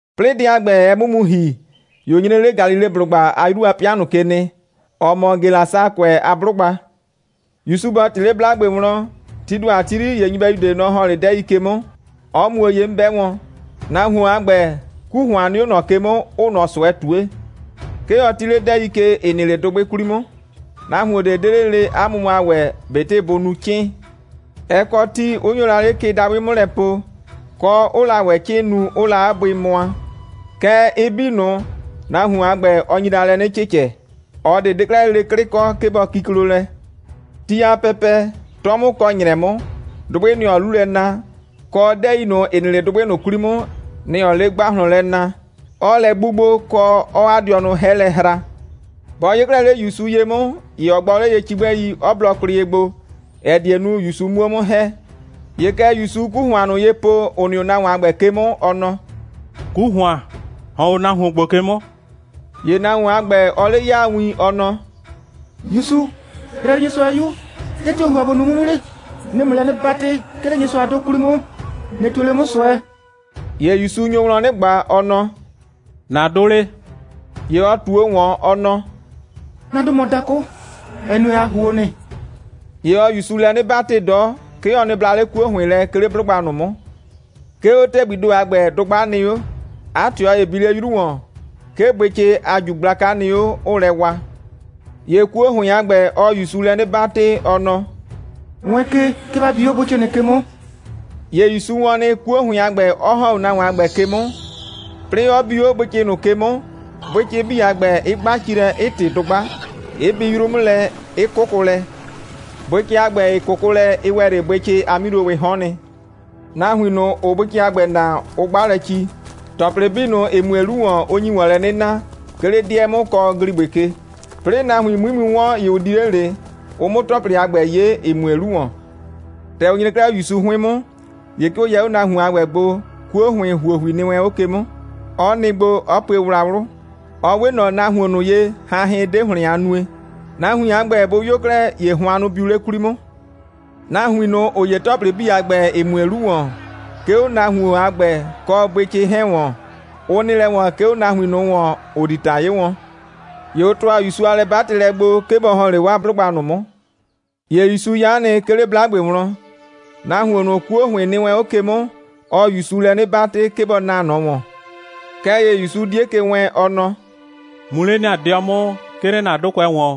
'Plɩɩ dɛ a ‑gbɛ, ɛ 'mʋ mu ‑hi, ‑ye ʋ nyre 'le Galileblʋgba a 'yru a 'pɩa ꞊nʋ ke nɩ, ‑ɔ mɔ Gelasakʋɛ a 'blʋgba. ‑Yusu bɔ ꞊tɩ 'le 'blagbe wlɔn, tii ‑do a ti 'yri, ‑ye nyɩbɛyu ꞊de, nɔ‑ ‑hɔn 'le 'dɛɛi ke 'mʋ, 'ɔ muo ye 'mʋ 'bɛ wɔn. Nahuon a ‑gbɛ, 'ku ‑hʋan nɩ 'o ꞊nɔ 'ke 'mʋ, 'ʋʋ ꞊nɔ ꞊sʋɛ ꞊tue. 'Ke ɔ 'ti 'le 'dɛɛi ke, ‑ɩ nɩ 'le dʋgbɩ 'kwli 'mʋ. Nahuon ꞊de 'de 'le lele 'a mʋmʋa ‑wɛ, ꞊betɩ bʋ nu 'cɩɩn. Ɛ kɔ ti, 'ʋ nyo la 'le kɩ dabʋɩ 'mʋ lɛ po, kɔ, 'ʋʋ la ‑wɛ 'cɩɩn nu, 'ʋʋ la 'a bʋɩ mʋa. Kɛɛ, ɩ 'bii ꞊nʋ, nahuon a ‑gbɛ, ɔ nyi la lɛ 'nɩ cɩcɛ. ꞊Ɔ ꞊de 'de 'klɛɛ lele 'klɩ kɔ, 'ke bɔ kiklo lɛ. Ti a pɛpɛ, 'tɔ 'mʋ kɔ ‑nyrɛ 'mʋ, dʋgbɩ, nɩ‑ ɔɔ 'lu lɛ na, kɔ 'dɛɛi ꞊nʋ, ‑ɩ nɩ 'le dʋgbɩ ꞊nʋ 'kwli 'mʋ, nɩ‑ ɔɔ 'le ‑gbahlɔn lɛ na, 'ɔɔ lɛ 'gbugbo, kɔ, 'ɔɔ 'a dɩɔnʋ 'hɛ lɛ hra. Bɔ 'yee 'klɛɛ 'le ‑Yusu ye 'mʋ, ‑ye ɔ gbɔ 'le ye cigbɛi, 'ɔ blɔ kwlɩ ye gbo, ‑ɛ die nu, ‑Yusu 'muo 'mʋ ‑hɛ. ‑Ye kɛ ‑Yusuu 'ku ‑hʋan ꞊nʋ ye po, ‑ʋ nɩ 'o nahuon a ‑gbɛ ke 'mʋ, ɔ nɔ: «'Ku ‑hʋan, ‑hɔn 'o nahuon ‑gbo ke 'mʋ!» ‑Ye nahuon a ‑gbɛ, ɔɔ 'le 'yaa win, ɔ nɔ: «‑Yusu, Yrayrɩnyɩsʋa a 'Yu, dɛ tio‑ ‑n ‑hʋa ‑bo nu 'mʋ 'mʋ 'le? 'Nɩɩ ‑mʋ lɛ 'nɩ 'batɩ, 'ke 'le Nyɩsʋa a 'dʋ 'kwli 'mʋ, ꞊nɩ ꞊tue 'le 'mʋ ꞊sʋɛ.» ‑Ye ‑Yusu nyo wlɔn 'nɩ ꞊gba, ɔ nɔ: «‑Na 'dʋ 'le?» ‑Ye ɔ ꞊tuo ‑wɔn, ɔ nɔ: «'Na 'dʋ mɔ dakʋ, ‑ɛ nue, ‑a ‑huo nɩ.» ‑Ye ɔɔ ‑Yusu lɛ 'nɩ 'batɩ 'dɔ, 'ke ɔ nɩ bla 'le 'kuo ‑hʋɩn lɛ, 'ke 'le 'blʋgba ꞊nʋ 'mʋ. 'Ke 'o ‑tɛgbii ‑do a ‑gbɛ, dʋgba nɩ 'o. 'A ꞊tɩɔ ‑ye bi 'le 'yru ‑wɔn. 'Ke bʋɩcɩ a ꞊ju gblaka nɩ 'o, 'ʋʋ lɛ wa. ‑Ye 'kuo ‑hʋɩn a ‑gbɛ, ɔɔ ‑Yusu lɛ 'nɩ 'batɩ, ɔ nɔ: «Wɛɛn ke, 'ke ‑ba bi 'o bʋɩcɩ ꞊nʋ ke 'mʋ!» ‑Ye ‑Yusu wɔn nɩ, 'kuo ‑hʋɩn a ‑gbɛ 'ɔ ‑hɔn 'o nahuon a ‑gbɛ ke 'mʋ, 'plɩɩ 'ɔ bi 'o bʋɩcɩ ꞊nʋ ke 'mʋ, bʋɩcɩ 'bii a ‑gbɛ, 'ɩ 'gba ci lɛ, 'ɩ ꞊tɩ dʋgba, 'ɩ bi 'yru 'mʋ lɛ, 'ɩ 'kʋkʋ lɛ. Bʋɩcɩ a ‑gbɛ, ‑ɩ 'kʋkʋ lɛ, ɩ ‑wɛ 'le bʋɩcɩ a 'milowɩɩ 'hɔɔn nɩ. Nahuin ꞊nʋ, ‑ʋʋ bʋɩcɩ a ‑gbɛ naa, ʋ 'gba lɛ ci, ‑tɔplɩ 'bii ꞊nʋ, ‑ɩ mue 'lu ‑wɔn, 'ʋ nyi ‑wɔn lɛ na, 'ke 'le 'dɩɛ 'mʋ, kɔ ‑gligbɩ ke. 'Plɩɩ nahuin 'mui mu 'wɔn, ‑ye ʋ di 'le ꞊le, ʋ 'mʋ ‑tɔplɩ a ‑gbɛ 'ye, ‑ɩ mue 'lu ‑wɔn. ‑Tɛ ʋ nyre 'klɛɛ 'o ‑Yusu 'hʋɩn 'mʋ, ‑ye 'ke ʋ yɛ 'o nahuon a ‑gbɛ gbo, 'kuo ‑hʋɩn ‑huohui nɩ wɛn 'o ke 'mʋ, 'ɔ nɩ gbo, 'ɔ pue wlawlʋ. Ɔ 'we ꞊nɔ nahuon ꞊nʋ ye, hanhɩn 'de ‑hlɩn a nue. Nahuin a ‑gbɛ bʋ 'yo 'klɛɛ, ‑ye hʋannʋ biu 'le 'kwli 'mʋ. Nahuin ꞊nʋ, ‑ʋ 'ye ‑tɔplɩ 'bii a ‑gbɛ, ‑ɩ mue 'lu ‑wɔn, 'ke 'o nahuon a ‑gbɛ kɔ bʋɩcɩ 'hɛɛn ‑wɔn, ʋ nɩ lɛ ‑wɔn, 'ke 'o nahuin ꞊nʋ ‑wɔn, ‑ʋ di ‑ta 'ye wɔn. ‑Ye ʋ ‑tʋa ‑Yusu a lɛ'batɩlɛ gbo, 'ke bɔ ‑hɔn 'le 'waa 'blʋgba ꞊nʋ 'mʋ. ‑Ye ‑Yusu 'ya nɩ, 'ke 'le 'blagbe wlɔn. Nahuon ꞊nʋ, 'kuo ‑hʋɩn nɩ wɛn 'o ke 'mʋ, ɔɔ ‑Yusu lɛ 'nɩ 'batɩ, 'ke bɔ naa ꞊nɔ ‑wɔn. Kɛɛ ‑ye ‑Yusu 'die ke wɛɛn, ɔ nɔ: «Mu 'le ‑na 'dɩɔ 'mʋ, 'ke 'le ‑na 'dʋkʋɛ ‑wɔn,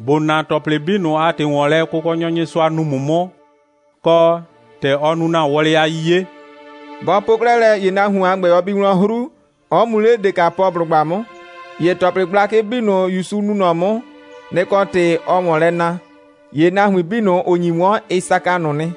‑bo na ‑tɔplɩ 'bii ꞊nʋ a ‑tɩ ‑wɔn lɛ, Kʋkɔnyɔ Nyɩsʋa nu ‑mʋ 'mʋ, kɔ, ‑tɛ ɔ nu ‑na wɔlɩ a 'yiye.» Bɔ po 'klɛɛ lɛ, ‑ye nahuon a ‑gbɛ, ɔ bi wlɔn 'hru, 'ɔ mu 'le Dekapɔblʋgba 'mʋ. ‑Ye ‑tɔplɩ gblakɩ 'bii ꞊nʋ, ‑Yusu nu ꞊nɔ 'mʋ, nɩ‑ kɔ ‑tɩ, ɔɔ ‑wɔn lɛ na. ‑Ye nahuin 'bii ꞊nʋ, ‑ʋ nyi 'wɔn, ɩ saka ꞊nʋ nɩ.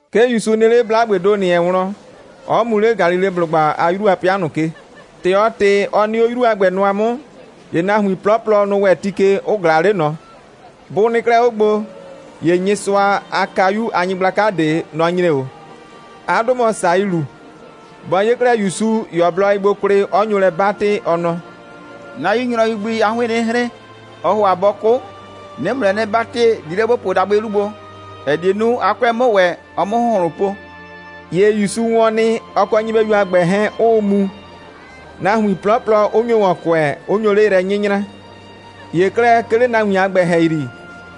'Ke ‑Yusu nɩ 'le 'blagbee ‑do ‑nɩ wɛn wlɔn, 'ɔ mu 'le Galileblʋgba a 'yru a 'pɩa ꞊nʋ ke. ‑Tɛ ɔ ꞊tɩ, 'ɔ nɩ 'o 'yru a ‑gbɛ nʋa 'mʋ, ‑ye nahuin 'plɔplɔ, nʋ‑ ‑wɛ ti ke, 'ʋ ꞊glaa 'le ꞊nɔ. Bʋ nɩ 'klɛɛ 'o gbo, ‑ye Nyɩsʋa a kayu a nyɩgblaka ꞊de, nɔ‑ nyre 'o. 'A 'dʋ mɔ Sayilu. Bɔ 'ye 'klɛɛ ‑Yusu, ‑ye ɔ blɔ ye gbo kwlɩ, 'ɔ nyo lɛ 'batɩ, ɔ nɔ: «'Na 'yu nyrɔyu gbi, 'a 'hʋɩɩn 'nɩ hren, ɔɔ ‑hʋa bɔ 'kʋ. 'Nɩɩ ‑mʋ lɛ 'nɩ 'batɩ, di 'le ‑bo puo dabʋɩ 'lu gbo, ‑ɛ die nu, 'a 'kʋɛ 'mʋ ‑wɛ, ɔ 'mʋ ‑hʋnhlʋn po.» ‑Ye ‑Yusu wɔn nɩ, ɔ kɔ nyɩbɛyu a ‑gbɛ 'hɛɛn 'ʋʋ mu, nahuin 'plɔplɔ 'ʋ nyo ‑wɔn kʋɛ, 'ʋ nyo 'le yrɛ 'nyɩnyraa. ‑Ye 'klɛɛ, 'ke 'le nahuin a ‑gbɛ ‑hɛyri,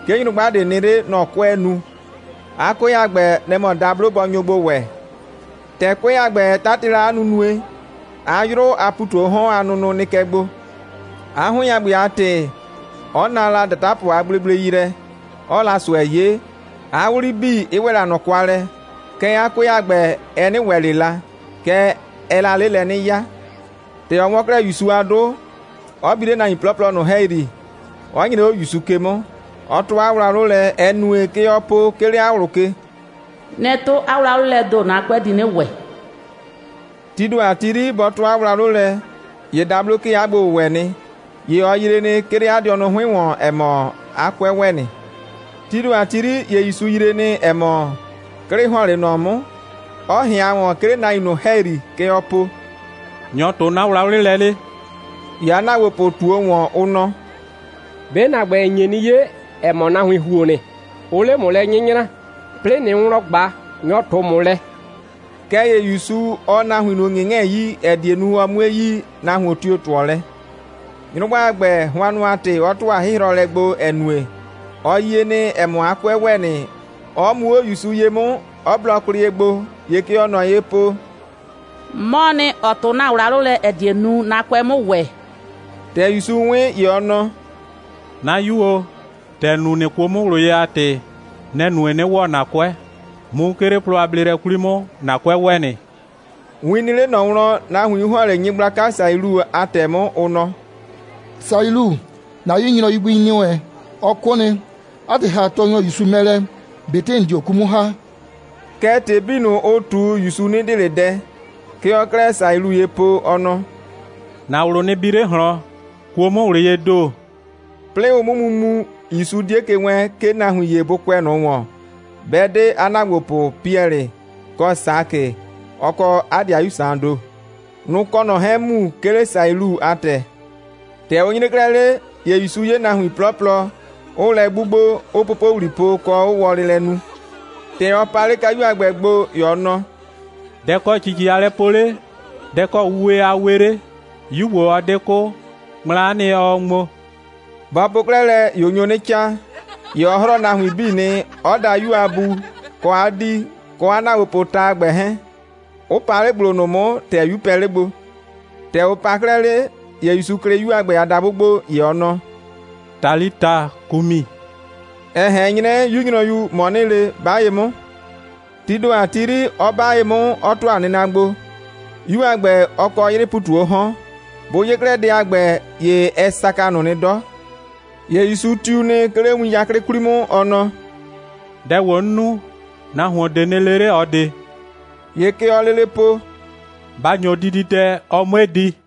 'ke nyrʋgba ꞊de nɩ 'le. Nɔ‑ 'kʋɛɛ nu. 'A 'kʋɛ a ‑gbɛ, nɛ‑ mɔ dablo bɔ nyo gbo ‑wɛ. ‑Tɛ 'kʋɛ a ‑gbɛ, ɛ 'tatɩ la 'a nunue, 'a 'yrʋ a ‑pu ꞊tu 'o 'hɔn a nʋnʋ nɩ kɛ gbo. 'A 'hʋɩn a ‑gbɛ a ‑tɩ, 'ɔ na la ‑datapʋ a gblegblei yrɛ, 'ɔɔ la ꞊sʋɛ 'ye, 'a 'wli 'bii 'ɩ ‑wɛ la ꞊nɔ kwa lɛ. Kɛɛ, 'a 'kʋɛ a ‑gbɛ, ɛ 'nɩ ‑wɛ ꞊le la, kɛɛ, ɛɛ la 'le lɛ 'nɩ 'yaa. ‑Tɛ ɔ 'wɔn 'klɛɛ ‑Yusu a 'dʋ, 'ɔ bi 'le nahuin 'plɔplɔ ꞊nʋ ‑hɛyri, 'ɔ nyre 'o ‑Yusu ke 'mʋ, 'ɔ 'tʋ 'a wlawlʋ lɛ, ‑ɛ nue, kɛ ɔɔ po, 'ke 'le 'a ꞊wlʋ ke: «'Nɩ 'tʋ 'a wlawlɩ lɛɛ ‑do, 'na 'kʋɛ di 'nɩ ‑wɛ.» Tii ‑do a ti 'yri, bɔ 'tʋ 'a wlawlʋ lɛ, ‑ye dablo 'kee 'a gbo‑wʋwɛ nɩ. ‑Ye ɔ yree nɩ, 'ke 'le 'a dɩɔnʋ 'hʋɩn ‑wɔn, ‑ɛ mɔ, 'a 'kʋɛ ‑wɛ nɩ. Tii ‑do a ti 'yri, ‑ye ‑Yusu yree nɩ, ‑ɛ mɔ, 'klɩ ‑hɔn 'le ꞊nɔ 'mʋ, 'ɔ ꞊hɩan ‑wɔn, 'ke 'le nahuin ꞊nʋ ‑hɛyri, kɛ ɔɔ po: «Nyɔ‑ 'tʋ 'na wlawlɩ lɛ 'le?» ‑Ye 'a ‑naagbopʋ ꞊tuo ‑wɔn, ʋ nɔ: «'Be ‑na ‑gbɛ, ‑n nye 'nɩ 'ye, ‑ɛ mɔ, nahuin ‑huo nɩ, 'ʋʋ 'le ‑mʋ yrɛ 'nyɩnyraa. 'Plɩɩ ꞊nɩɩ wlɔn ꞊gba: Nyɔ‑ 'tʋ 'mʋ lɛ.» Kɛɛ ‑ye ‑Yusu, ɔɔ nahuin ꞊nʋ ‑ŋɩŋɛɛ 'yii, ‑ɛ die nu, ɔ 'mui yi, nahuon tio‑ 'tʋɔ lɛ. Nyrʋgba a ‑gbɛ, hʋannʋ a ‑tɩ, ɔ ‑tʋa 'hɩhrɔlɛ gbo, ‑ɛ nue, ɔ yie nɩ, ‑ɛ mɔ, 'a 'kʋɛ ‑wɛ nɩ, 'ɔ mu 'o ‑Yusu ye 'mʋ, 'ɔ blɔ kwlɩ ye gbo, ‑ye kɛ ɔɔ ꞊nɔ ye po: «'Mɔɔ nɩ, ‑ɔ 'tʋ ‑na wlawlʋ lɛ, ‑ɛ die nu, 'na 'kʋɛ 'mʋ ‑wɛ.» ‑Tɛ ‑Yusu 'wɩn, ‑ye ɔ nɔ: «'Na 'yu o, ‑tɛ ‑n kuo 'mʋ ꞊wlʋ ye a ‑tɩ, nɛ‑ nue, 'nɩ ‑wɔ ‑na 'kʋɛ. Mu, 'ke 'le plɔ a bleelɛ 'kwli 'mʋ, ‑na 'kʋɛ ‑wɛ nɩ.» Win nɩ 'le ꞊nɔ wlɔn, nahuin 'ʋ ‑hɔn 'le nyɩgblaka Sayilu a ‑tɛ 'mʋ, ʋ nɔ: «Sayilu, ‑na 'yu nyrɔyu gbi ‑nɩ wɛn, ɔ 'kʋ nɩ. 'A ‑tɩ, ‑ha Tɔɔnyɔ ‑Yusu mɛ lɛ, ꞊betɩ ‑n dio 'ku 'mʋ ‑ha.» Kɛɛ, ‑tɩ 'bii ꞊nʋ, ʋ ꞊tu, ‑Yusu 'nɩ dɩɩ ꞊le dɛ. Kɛ ɔɔ 'klɛɛ Sayilu ye po, ɔ nɔ: «‑Na ꞊wlʋ nɩ bi 'le ꞊hlɔn, kuo 'mʋ ꞊wlʋ yee ‑do!» 'Plɩɩ ʋ 'mʋ mu mu, ‑Yusu 'die ke wɛɛn, 'ke nahuin ‑ye bʋ kʋɛ ꞊nɔ ‑wɔn, 'bɛ 'de 'a ‑naagbopʋ Piɛlɩ, kɔ Sakɩ, ɔ kɔ 'a 'dɩayu Saan ‑do. Nʋ‑ kɔ ꞊nɔ 'hɛɛn mu, 'ke 'le Sayilu a ‑tɛ. ‑Tɛ ʋ nyre 'klɛɛ 'le, ‑ye ‑Yusu 'ye nahuin 'plɔplɔ, 'ʋʋ lɛ 'gbugbo, 'ʋʋ popowli po, kɔ, 'ʋʋ wɔlɩ lɛ nu. ‑Tɛ ɔ pa 'le kayu a ‑gbɛ gbo, ‑ye ɔ nɔ: «Dɛ‑ kɔ ‑cici a lɛ po 'le? Dɛ‑ kɔ ‑wɛ wuwe 'le? 'Yu ‑gbo, ɔ 'de 'kʋ. Ŋmla'a nɩ, ɔɔ ŋmo.» Bɔ po 'klɛɛ lɛ, ‑ye ʋ nyo 'nɩ 'caa. ‑Ye ɔ 'hrɔɔ nahuin 'bii nɩ, 'ɔ da 'yu a bu, kɔ 'a 'dii, kɔ 'a ‑naagbopʋʋ ta a ‑gbɛ 'hɛɛn, 'ʋ pa 'le ‑gblo ꞊nʋ 'mʋ, ‑tɛ 'yu pɛ 'le gbo. ‑Tɛ ʋ pa 'klɛɛ 'le, ‑ye ‑Yusu klɩ 'yu a ‑gbɛ a dabʋ gbo, ‑ye ɔ nɔ: «Talita kumi!» ‑ɛ ꞊hɛn 'nyrɛ: «'Yu nyrɔyu, ‑mɔ 'nɩɩ le, 'ba ye 'mʋ!» Tii ‑do a ti 'yri, 'ɔ 'ba ye 'mʋ, 'ɔ ‑tʋa nɩna gbo. 'Yu a ‑gbɛ, ɔ kɔ 'yrɩɩ ‑pu ꞊tu 'o 'hɔn. Bʋ 'ye 'klɛɛ dɛ a ‑gbɛ, ye ɛ saka ꞊nʋ nɩ 'dɔ. ‑Ye ‑Yusu tiu nɩ, 'ke 'le win 'yaklɩ 'kwli 'mʋ, ɔ nɔ: «Dɛ ‑gbo, 'n nu, nahuon ꞊de nɩ le 'le ꞊ɔ ꞊de!» ‑Ye kɛ ɔɔ lele po: «Ba ‑nyo dididɛ, ɔ 'mue di!»